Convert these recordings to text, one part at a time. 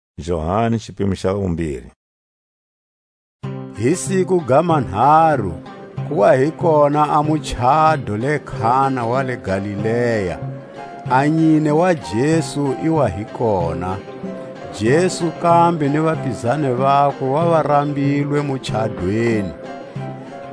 A muchado wa le Kana. Hi siku ga manharu, ku wa hi kona a muchado le Kana wa le Galilea; a nyine wa Jesu i wa hi kona; Jesu kambe ni vapizani vakwe va wa rambilwe muchadweni.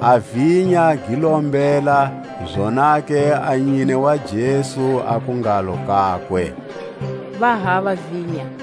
A vinya gi lo mbhela, zonake a nyine wa Jesu aku ngalo kakwe: Va hava vinya.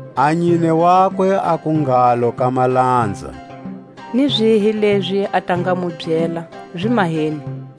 A nyine wakwe aku ngalo ka malanza: Ni zihi lezi a ta nga mu byela, zi maheni.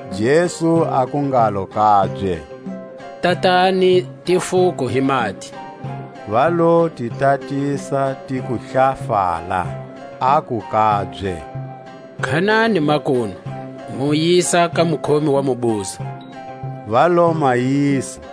Jesu aku ngalo kabye: Tatani tifuko hi mati. Va lo ti tatisa tiku hlafala. Aku kabye: Khanani makunu, mu yisa ka mukhomi wa mubuzo. Va lo ma yisa.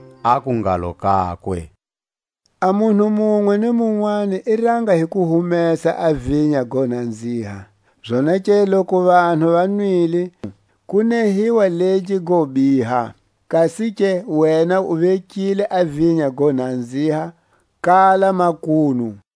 aku ngalo kakwe: A munhu munwe ni munwani i ranga hi ku humesa a vinya go nanziha; zonake loku vanhu va nwile, ku nehiwa legi go biha; kasike wena u vekile a vinya go nanziha kala makunu.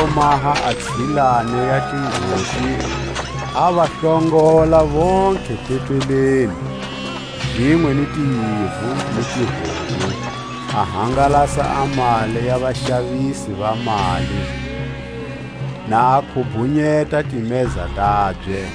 I lo maha a tsilani ya tingoti, a va hlongola vontlhe tempeleni, zinwe ni tiyivu ni tihomu; a hangalasa a mali ya vaxavisi va mali, na a khubhunyeta timeza tabye.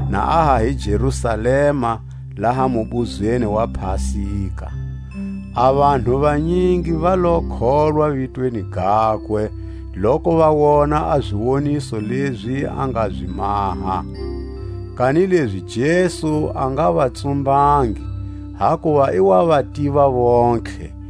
Na a ha hi Jerusalema laha mubuzweni wa Pasika, a vanhu vanyingi va lo kholwa vitweni gakwe, loku va wona a ziwoniso lezi a nga zi maha. Kanilezi Jesu a nga va tsumbangi, hakuva i wa va tiva vontlhe,